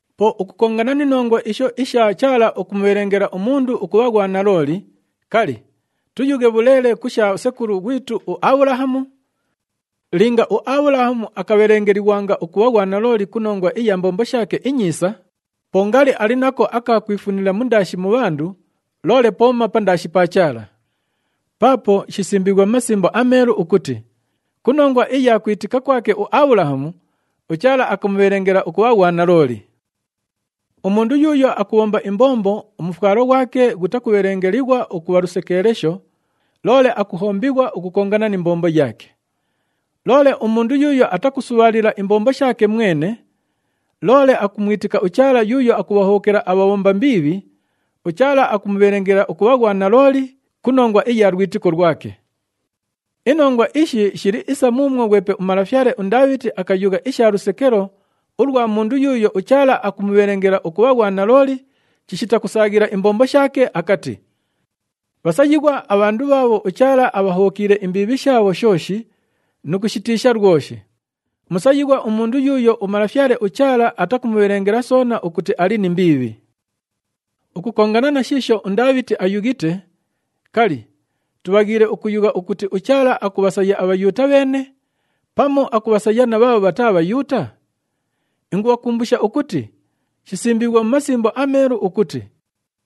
Po ukukongana ni nongwa isho isha Chaala ukumubhelengela umundu ukubha ghwanalooli, kali, tuyughe bhuleele ku sha sekulu ghwitu uAbhulahamu? Linga uAbhulahamu akabhelengelighwanga ukubha ghwanalooli ku nongwa iya mbombo shaake inyiisa, po ngali ali nako aka kwifunila mundaashi mu bhandu, loole pooma pandaashi pa Chaala. Paapo shisimbiighwe mu Masimbo aMeelu ukuti, “Ku nongwa iya kwitika kwake uAbhulahamu, uChaala akamubhelengela ukubha ghwanalooli.” Umundu yuuyo akubhomba imbombo, umufwalo ghwake ghutakubhelengelighwa ukubha lusekeelesho, loole akuhombighwa ukukongana ni mbombo yaake. Loole umundu yuuyo atakusubhaalila imbombo shaake mwene, loole akumwitika uChaala yuuyo akubhahobhokela abhabhomba mbiibhi, uChaala akumubhelengela ukubha ghwanalooli ku nongwa iya lwitiko lwake. Inongwa ishi shili isa muumwo ghwepe umalafyale uNdaabhiti akayugha isha lusekelo ulwa mundu yuuyo uChaala akumubhelengela ukubha ghwanalooli chishita kusaaghila imbombo shaake akati, “Bhasayighwa abhandu bhaabho uChaala abhahobhokiile imbiibhi shaabho shooshi nu kushitiisha lwoshi. Musayighwa umundu yuuyo uMalafyale uChaala atakumubhelengela soona ukuti ali ni mbiibhi.” Ukukongana na shiisho uNdaabhiti ayughite, kali, tubhaghiile ukuyugha ukuti uChaala akubhasaya aBhayuuta bheene, pamu akubhasaya na bhaabho bhataa Bhayuuta? Ingubhakumbusha ukuti shisimbiighwe mu Masimbo aMeelu ukuti,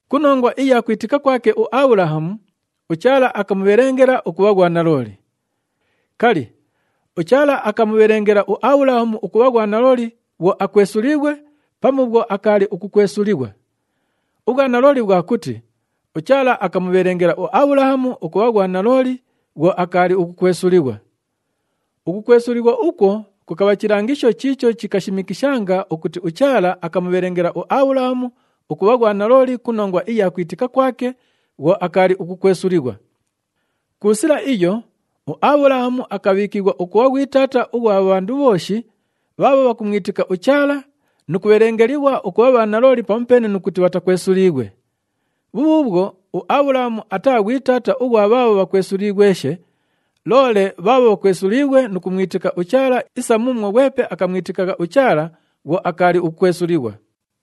“Ku nongwa iya kwitika kwake uAbhulahamu, uChaala akamubhelengela ukubha ghwanalooli.” Kali, uChaala akamubhelengela uAbhulahamu ukubha ghwanalooli bhwo akwesuliighwe pamu bhwo akaali ukukwesulighwa? Ubhwanalooli bhwa kuti uChaala akamubhelengela uAbhulahamu ukubha ghwanalooli bhwo akaali ukukwesulighwa. Ukukwesulighwa ukwo kukabha chilangisho chiicho chikashimikishanga ukuti uChaala akamubhelengela uAbhulahamu ukubha ghwanalooli ku nongwa iya kwitika kwake bhwo akaali ukukwesulighwa. Ku sila iyo, uAbhulahamu akabhiikighwa ukubha ghwi taata ughwa bhandu bhooshi bhaabho bhakumwitika uChaala nu kubhelengelighwa ukubha bhanalooli pamupeene nu kuti bhatakwesuliighwe. Bhubhuubhwo, uAbhulahamu ataa ghwi taata ughwa bhaabho bhakwesuliighweshe, loole bhaabho bhakwesuliighwe nu kumwitika uChaala isa muumwo ghwepe akamwitikagha uChaala bhwo akaali ukukwesulighwa.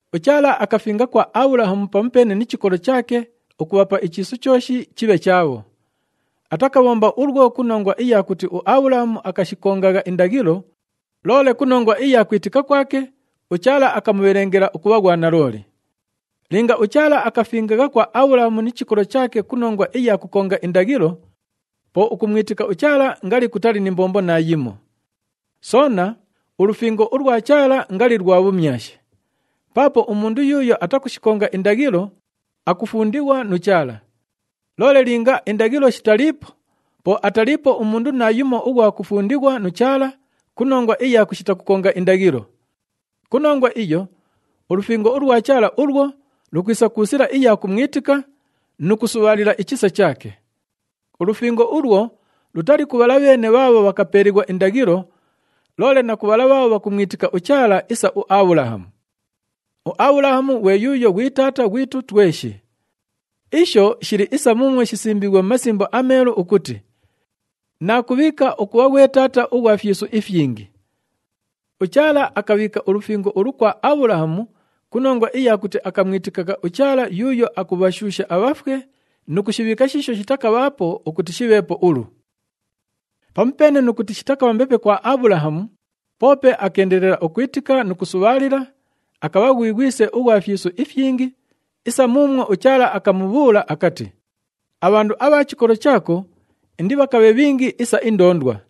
UChaala akafinga kwa Abhulahamu pamupeene ni chikolo chaake ukubhapa ichiisu chooshi chibhe chaabho. Atakabhomba ulwo ku nongwa iya kuti uAbhulahamu akashikongagha indaghilo, loole ku nongwa iya kwitika kwake, uChaala akamubhelengela ukubha ghwanalooli. Linga uChaala akafingagha kwa Abhulahamu ni chikolo chaake ku nongwa iya kukonga indaghilo, po ukumwitika uChaala ngali kutali ni mbombo naayimo. Soona, ulufingo ulwa Chaala ngali lwa bhumyashi. Paapo umundu yuuyo atakushikonga indaghilo, akufundighwa nu Chaala. Loole linga indaghilo shitaliipo, po ataliipo umundu naayumo ughwa kufundighwa nu Chaala ku nongwa iya kushita kukonga indaghilo. Ku nongwa iyo, ulufingo ulwa Chaala ulwo lukwisa ku sila iya kumwitika nu kusubhaalila ichisa chaake. Ulufingo ulwo lutali ku bhala bheene bhaabho bhakapeelighwa indaghilo, loole na ku bhala bhaabho bhakumwitika uChaala isa uAbhulahamu. UAbhulahamu ghwe yuuyo ghwi taata ghwitu tweshi. Isho shili isa muumwo shisimbiighwe mu Masimbo aMeelu ukuti, “Naakubhiika ukubha ghwe taata ughwa fyisu ifyingi.” UChaala akabhiika ulufingo ulu kwa Abhulahamu ku nongwa iya kuti akamwitikagha uChaala yuuyo akubhashuusha abhafwe nu kushibhiika shiisho shitakabhaapo ukuti shibheepo ulu. Pamupeene nu kuti shitakabha mbepe kwa Abhulahamu, poope akeendelela ukwitika nu kusubhaalila, akabha ghwi ghwise ughwa fyisu ifyingi isa muumwo uChaala akamubhuula akati, “Abhandu abha chikolo chaako indibhakabhe bhingi isa indoondwa.”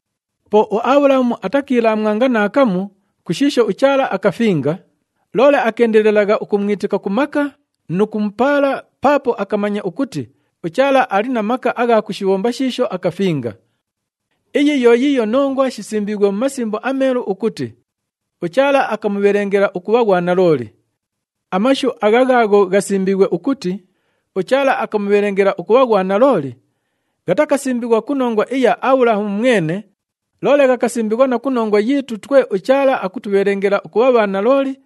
Po uAbhulahamu atakiilaamwanga naakamu ku shiisho uChaala akafinga, loole akeendelelagha ukumwitika ku maka nu kumupaala, paapo akamanya ukuti uChaala ali na maka agha kushibhomba shiisho akafinga. Iyi yo yiiyo nongwa shisimbiighwe mu Masimbo aMeelu ukuti, “UChaala akamubhelengela ukubha ghwanalooli.” Amashu agha ghaagho ghasimbiighwe ukuti, “UChaala akamubhelengela ukubha ghwanalooli,” ghatakasimbighwa ku nongwa iya Abhulahamu mwene, loole ghakasimbighwa na ku nongwa yiitu twe uChaala akutubhelengela ukubha bhanalooli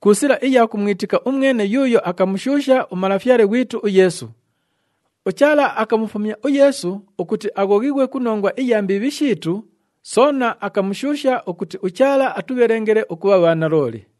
ku sila iya kumwitika umwene yuuyo akamushuusha uMalafyale ghwitu uYeesu. UChaala akamufumya uYeesu ukuti aghoghighwe ku nongwa iya mbiibhi shiitu, soona akamushuusha ukuti uChaala atubhelengele ukubha bhanalooli.